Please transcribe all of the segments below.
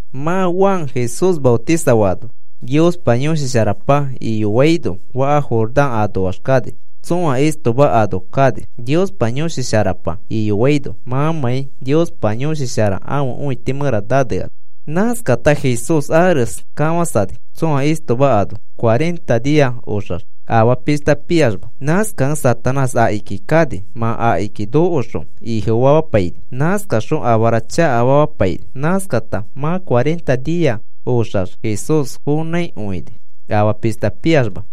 Mã Juan Jesús maotisafaano Niospa Yõshi Sharapa iyoaino faka Jordán anoax kani. Tsõa istoma ano kani, Niospa Yõshi Sharapa iyoaino mãmãi Niospa Yõshi Shara ãfe õiti mẽra naneano. Nãskata Jesús ares kafãsani, tsõa istoma ano cuarenta nia oxax afaa pishta piaxma. Nãskakẽ Satanás akiki kani. Mã akiki nokoxõ ifofamapaini. Nãskaxõ afara chakafamapaini. Nãskata mã cuarenta nia oxax Jesús fonãikõini, afaa pishta piaxma.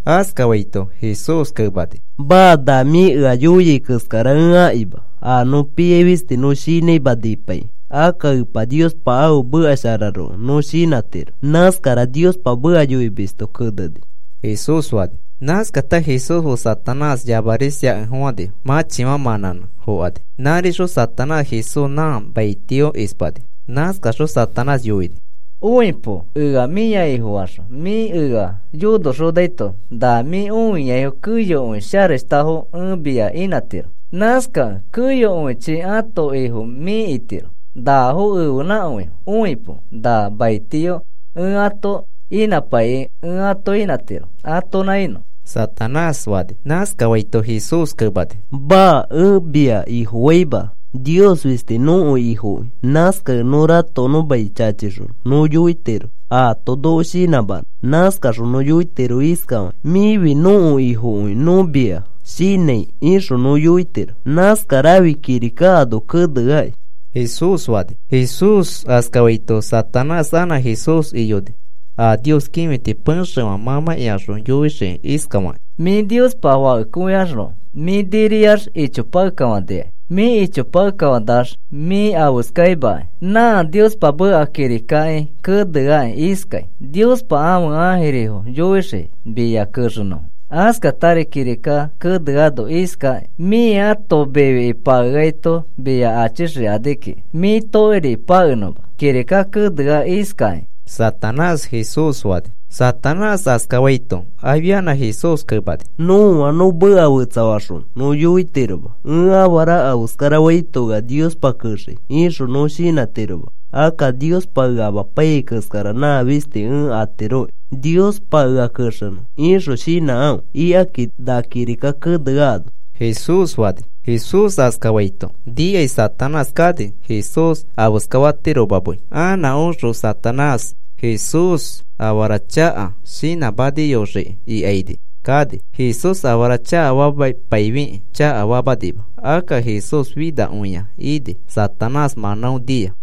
Nãskafaito Jesús kemani: “Maa, na mĩ ea yoiai keskara ẽ akima. A nõ piai fisti nõ shinãima nipaikĩ. Akka Epa Niospa ãfe meka shararoko nõ shinãtiro. Nãskara Niospa meka yoimisto keneni,” Jesús fani. Nãskata Jesús fe Satanás yamaris iakekẽfofãnifo. Mãchifã mãnãnẽ fokani. Nãrixõ Satanás Jesús nã maitio ispani. Nãskaxõ Satanás yoini: “Õipo, ea mĩa ifofaxõ mĩ ea yonoxonaito na mĩ õiaifo keyokõi sharashtakõifo ẽ mia inãtiro. Nãskakẽ keyokõichi ãto ifo mĩ itiro. Nafo ẽfenãkõifo. Õipo, na maitio ẽ ato inãpaiki ẽ ato inãtiro atonã inõ,” Satanás fani. Nãskafaito Jesús kemani: “Maa, ẽ mia ifofaima. Nios fisti nõko Ifokõi. Nãskakẽ nõ ratokonõ mai chachixõ nõ yoitiro aato noko shinãmanõ. Nãskaxõ nõ yoitiro iskafakĩ: ‘Mĩfi nõko Ifoki nõ mia shinãi,’ ixõ nõ yoitiro. Nãskarafi kirika ano keneakĩ,” Jesús fani. Jesús askafaito Satanás anã Jesús iyoni a Nios kĩfiti pexefã mãmãkĩaxõ yoixiki iskafakĩ: “Mĩ Niospa Fakekõiaxroko mĩ niriax ichopakekafanikai. Mĩ ichopakekafãnax mĩ afeskaimakai. Nã Niospa meka kirikaki keneaki iskai: ‘Niospa ãfe ãjirifo yoixii mia kexenõfo.’ Askatari kirika keneano iskaki: ‘Mĩ ãto mifiki pakeaito mia achixikani kiki mĩ tokiriki pakenõma,’ kirika kenea iskakĩ,” Satanás Jesús fani. Satanás askafaito afianã Jesús kemani: “Nõa nõ meka fetsafaxõ nõ yoitiroma, ‘Ẽ afara afeskarafaito, ea Niospa kexei,’ ixõ nõ shinãtiroma. Akka, ‘Niospa ea amapaiyai keskara nã fisti ẽ atiroki Niospa ea kexenõ,’ ixõ shinãkãfe, ikaki na kirika keneano,” Jesús fani. Jesús askafaito nikai Satanás kani, Jesús afeskafatiroma mei. Anã oxõ Satanás Jesús afara chaka shinãmaniyoxiki ikaini kani. Jesús afara chakafamapaifikĩ chakafamanima. Akka Jesús finakõia ini Satanás mãnão nia.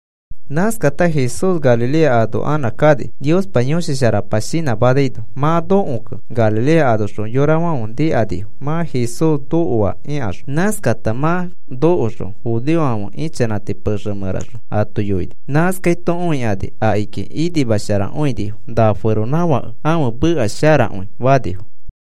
Nãskata Jesús Galilea ano anã kani, Niospa Yõshi Sharapa shinãmanaino. Mã nokokẽ Galilea anoxõ yorafãfe nikanifo mã Jesús nokoa ikaxõ. Nãskata mã nokoxõ judeofãfe ichanãti pexe mẽraxõ ato yoini. Nãskaito õikani, akiki inimasharakõinifo. “Na feronãfake ãfe meka sharakõi,” fanifo.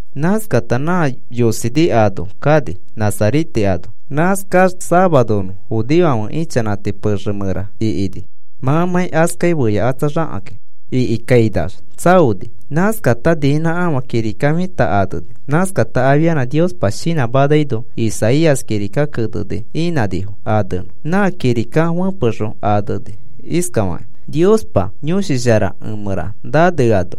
Nãskata nã yosini ano kani Nazarete ano. Nãskax safaronõ judeofãfe ichanãti pexe mẽra ikini mãmãi askai feyakatsaxakĩ. Ikikainax tsaoni. Nãskata niinãkafã kirika fita aneni. Nãskata afia Niospa shinãmanaino Isaías kirika keneni inãnifo anenõ. Nã kirika fepexõ aneni iskafakĩ: Niospa Yõshi Shara emẽra naneano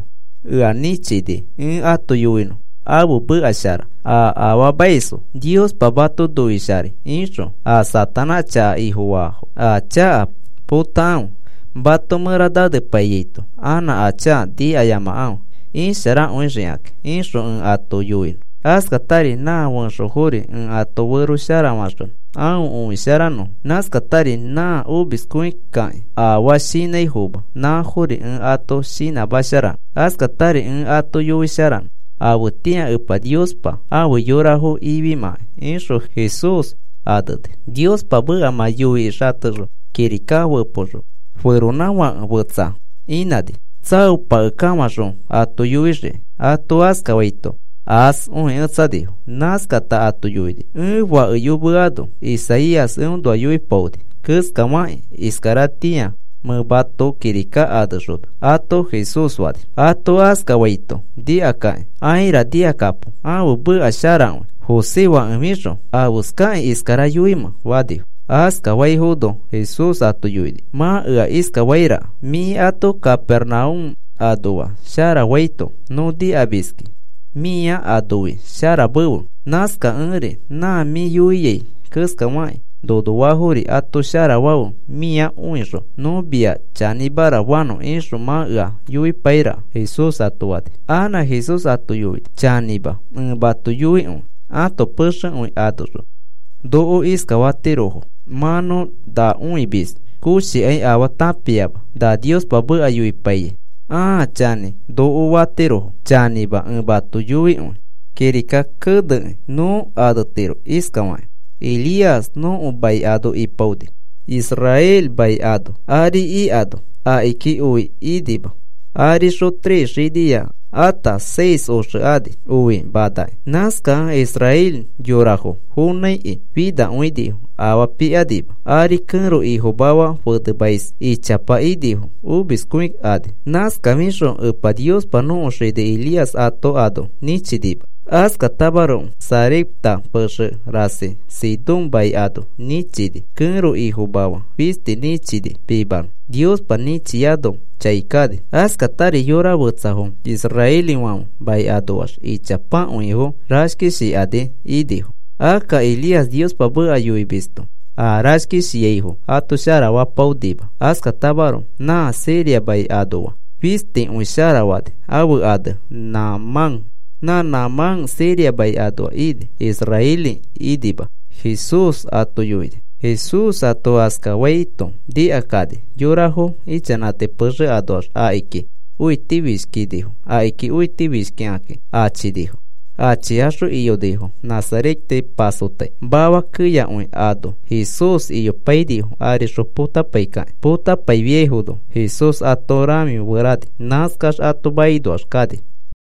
ea nĩchini ẽ ato yoinõ ãfe meka shara a afaamaisfo, “Niospa mato noisharai,” ixõ, “A Satanás chaka ifofaafo a chaka potakãfe, mato mẽra nanepaiyaito anã a chaka nikayamakãfe isharakõixikakĩ,” ixõ ẽ ato yoinõ; askatari nã fẽxofori ẽ ato fero sharafaxonõ aõ õisharanõfo: nãskatari nã omiskõikakĩ afaa shinãifoma nãfori ẽ ato shinãmasharanõ; askatari ẽ ato yoisharanõ afetĩa Epa Niospa afe yorafo ifimãkai, ixõ Jesús aneni. Niospa meka mã yoikĩ xatexõ kirika fẽpoxõ feronãfake fetsa inãni, tsaopakekafãxõ ato yoixiki. Ato askafaito aas õiketsanifo. Nãskata ato yoini: “Ẽ fakeyoamano Isaías eõnoa yoipaoni keskafakĩ iskaratĩa mẽ mato kirika anexona,” ato Jesús fani. Ato askafaito nikakakĩ: “¡Aira! Nikakapo, ãfe meka sharakõi. José fakefixõ ¿afeskakĩ iskara yoimẽ?” fanifo. Askafaifono Jesús ato yoini: “Mã ea iskafairaka: ‘Mĩ ato Capernaúm anoa sharafaito nõ nikamiski mĩa anoi sharamefe. Nãskakẽri nã mĩ yoiai keskafakĩ nonoafori ato sharafafe mia õixõ nõ mia chanĩmara fanõ,’ ixõ mã ea yoipairaka,” Jesús ato fani. Anã Jesús ato yoini: “Chanĩma ẽ mato yoikõi. Ãto pexekõi anoxõ noko iskafatirofo mã nõ na õimis koshikai afaa tãpiama na Niospa meka yoipaiyai aa chanĩ noko fatirofo. Chanĩma ẽ mato yoikõi. Kirika kenekĩ nõ anetiro iskafakĩ. Elías nõko mai ano ipaoni. Israel mai ano ari ikano akiki oi inima. Arixõ tres xinia ata seis oxe ani, oi manakĩ. Nãskakẽ israeli yorafo fonãiki finakõinifo, afaa pikanima. Ari kẽro ifomafa fenemais ichapa inifo omiskõikani. Nãskafixõ Epa Niospa nõko xini Elías ato ano nĩchinima. Askatamaroko Sarepta pexe rasi Sidón mai ano nĩchini kẽro ifomafa fisti nĩchini pimanõ. Niospa nĩchiaino chai kani. Askatari yora fetsafo israelifãfe mai anoax ichapakõifo rashkishikani inifo. Akka Elías Niospa meka yoimisto aa rashkishiaifo ato sharafapaonima. Askatamaroko nã Siria mai anoa fistikõi sharafani. Ãfe ane Naamán. Nã Naamán Siria mai anoa ini, israeli inima,” Jesús ato yoini. Jesús ato askafaito nikakani yorafo ichanãti pexe anoax akiki õitifishkinifo. Akiki õitifishkikaki achinifo. Achikaxõ iyonifo Nazarete pasotai mafa keyakõi ano Jesús iyopainifo arixõ potapaikakĩ. Potapaifiaifono Jesús ato rãfiferani. Nãskax ato makinoax kani.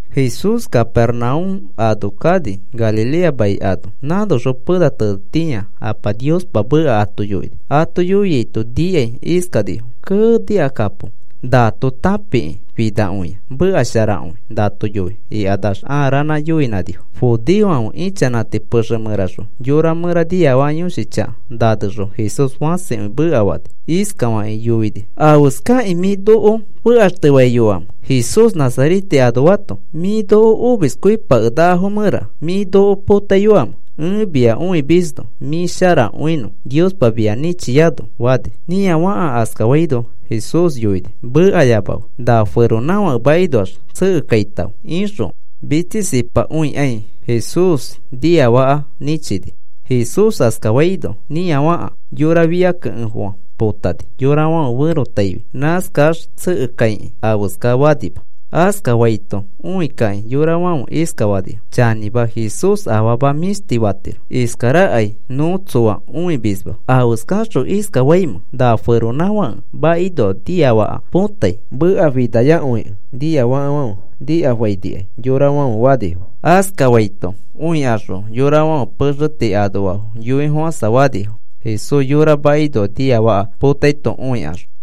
Jesús Capernaúm ano kani, Galilea mai ano. Nãnoxõ pena tenetitĩa Apa Niospa meka ato yoini. Ato yoiaito nikai iskanifo: “¡Kee! Nikakapo. Nato tãpikĩ finakõia, meka sharakõi nato yoi,” ikanax aa ranã yoinãnifo. Judeofãfe ichanãti pexe mẽraxõ yora mẽra niafaka yõshi chaka nanexõ Jesús fãsikõi mekafani. Iskafakĩ yoini: “¿Afeskakĩ mĩ noko fekaxtefaiyoamẽ, Jesús Nazarete anoato? ¿Mĩ noko a omiskõipakenakafo mẽra mĩ noko potaiyoamẽ? Ẽ mia õimisnõ, mĩ sharakõinõ Niospa mia nĩchiano,” fani. Nĩafaka askafaino Jesús yoini: “Mekayamafe. Na feronãfake makinoax tsekekaitãfe,” ixõ mitsisipakõikai Jesús niafaka nĩchini. Jesús askafaino nĩafaka yora fia kekẽfofã potafaini yorafãfe ferotaifi nãskax tsekekaikĩ afeskafanima. Askafaito õikakĩ yorafãfe iskafanifo: “Chanĩma, Jesús afama mĩshti fatiro. Iskarakai nõ tsõa õimisma. ¿Afeskaxõ iskafaimẽ, na feronãfake makinoa niafaka potai? Meka finayakõikẽ nĩafaka nikafainikai,” yorafãfe fanifo. Askafaito õikaxõ yorafãfe pexe tii anoafo yoifofãfofãinifo Jesús yora makinoa niafaka potaito õikaxõ.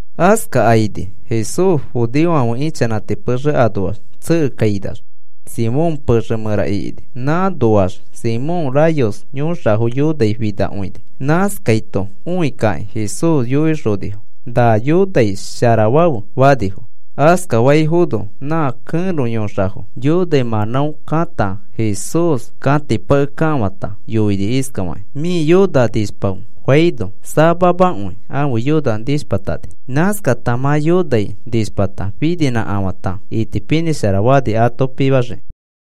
Askakaini Jesús judeofãfe ichanãti pexe anoax tsekekainax Simón pexe mẽra ikini. Nãnoax Simón rayos yõxafo yonai finakõini. Nãskaito õikakĩ Jesús yoixonifo: “Na yonai sharafafe,” fanifo. Askafaifono nã kẽro yõxafo yonai mãnão kãta Jesús kãtipakekafãta yoini iskafakĩ: “Mĩ yona nishpafe,” faino samamakõi ãfe yona nishpatani. Nãskata mã yonai nishpata, fininĩkafãta itipinĩshara fani ato pimaxiki.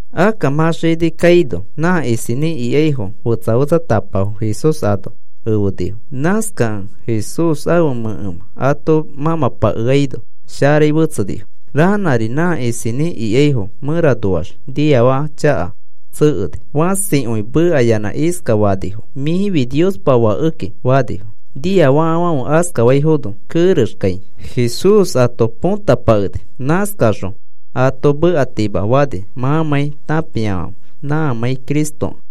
Akka mã xini kaino nã isinĩ ikaifo fetsa fetsatapafo Jesús ano efenifo. Nãskakẽ Jesús ãfe mẽkemã ato mãmãpakeaino sharai fetsenifo. Ranãri nã isinĩ ikaifo mẽranoax niafaka chakafo tsekeni. Fãsikõi mekayanã iskafanifo: “Mĩfi Niospa Fakekĩ,” fanifo. Niafakafãfe askafaifono kerexkai Jesús ato põtapakeni. Nãskaxõ ato mekatima fani mãmãi tãpiafãfe nãmãi Cristokẽ.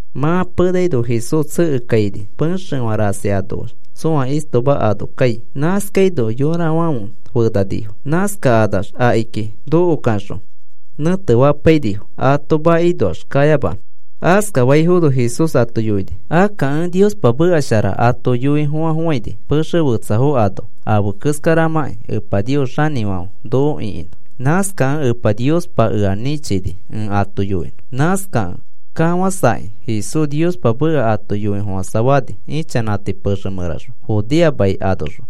Mã penaino Jesús tsekekaini, pexefã rasi anoax tsõa istoma ano kai. Nãskaino yorafãfe fenanifo. Nãskakanax akiki nokokaxõ nẽtefapainifo ato makinoax kayamanõ. Askafaifono Jesús ato yoini: “Akka, ẽ Niospa meka shara ato yoifofãfofãni pexe fetsafo ano afe keskaramãkĩ Epa Nios xanĩfãfe noko ĩkinã. Nãskakẽ Epa Niospa ea nĩchini, ẽ ato yoinõ.” Nãskakẽ kafãsakĩ Jesús Niospa meka ato yoifofãsafani, ichanãti pexe mẽraxõ Judea mai anoxõ.